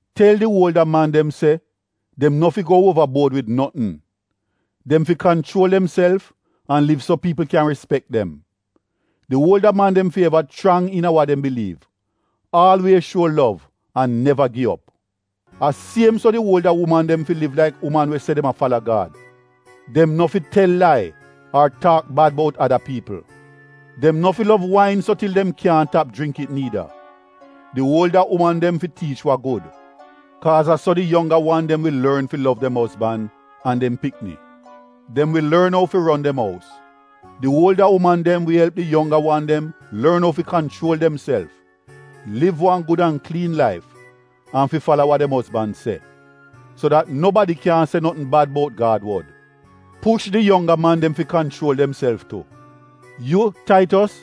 Tel di uolda man dem se dem no fi go uova buod wid notn. Dem fi kanchuol demself an liv so piipl kyan rispek dem. Di uolda man dem fi eva chrang iina wa dem biliiv, aalwiez shuo lov an neva gi op. A siem so di uolda uman dem fi liv laik uman we se dem a fala Gad. Dem no fi tel lai ar taak bad bout ada piipl. Dem no fi lov wain so til dem kyaahn tap jringk it niida. Di uolda uman dem fi tiich wa gud. Kaaz a so di yongga wan dem wi lorn fi lov dem ozban an dem pikni. Dem wi lorn ou fi ron dem ous. Di uolda uman dem wi elp di yongga wan dem lorn ou fi kanchuol demself, liv wan gud an kliin laif, an fi fala wa dem ozban se. So dat nobadi kyaahn se notn bad bout Gad wod. Push di yongga man dem fi kanchuol demself tu. Yu, Taitos,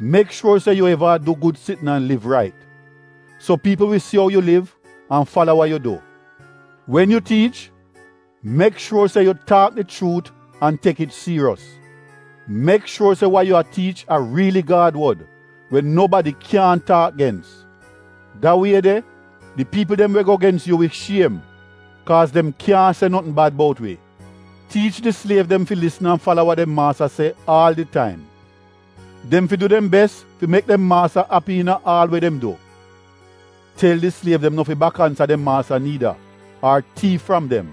mek shuor se yu eva a du gud sitn an liv rait, so piipl wi si ou yu liv an fala wa yu du. Wen yu tiich mek shuor se yu taak di chuut an tek it siiriyos. Mek shuor se wa yu a tiich a riili Gad wod we nobadi kyaahn taak gens. Da wie de di piipl dem we go gens yu wi shiem kaaz dem kyaahn se notn bad bout wi. Tiich di sliev dem fi lisn an fala wa dem maasta se aal di taim. Dem fi du dem bes fi mek dem maasta api iina aal we dem du. Tel di sliev dem no fi bak ansa dem maasta niida, ar tiif fram dem.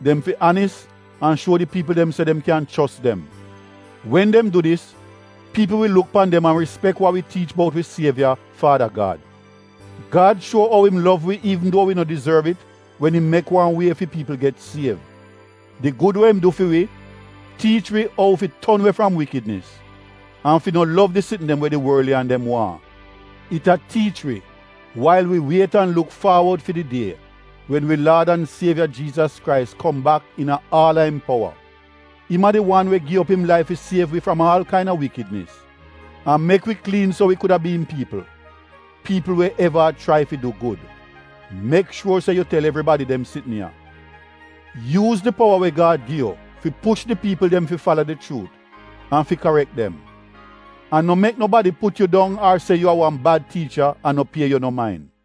Dem fi anis an shuo di piipl dem se dem kyan chos dem. Wen dem du dis, piipl wi luk pan dem an rispek wa wi tiich bout wi sievya Faada Gad. Gad shuo ou im gud tu wi wen im mek wan wie fi piipl get siev. Di gud we im du fi wi, tiich wi ou fi ton we fram wikidnis an fi no lov di sitn dem we di worliyan dem waahn. It a tiich wi wail wi wiet an luk faawod fi di die wen wi laad an sievya Jiizas Krais kom bak iina aal a im powa. Im a di wan we gi op im laif fi siev wi fram aal kaina wikidnis an mek wi kliin so wi kuda bi im piipl; piipl we eva a chrai fi du gud. Mek shuor se yu tel evribadi dem sitn ya. Yuuz di powa we Gad gi yu fi inkorij an karek di piipl dem. An no mek nobadi put yu dong ar se yu a wan bad tiicha an no pie yu no main.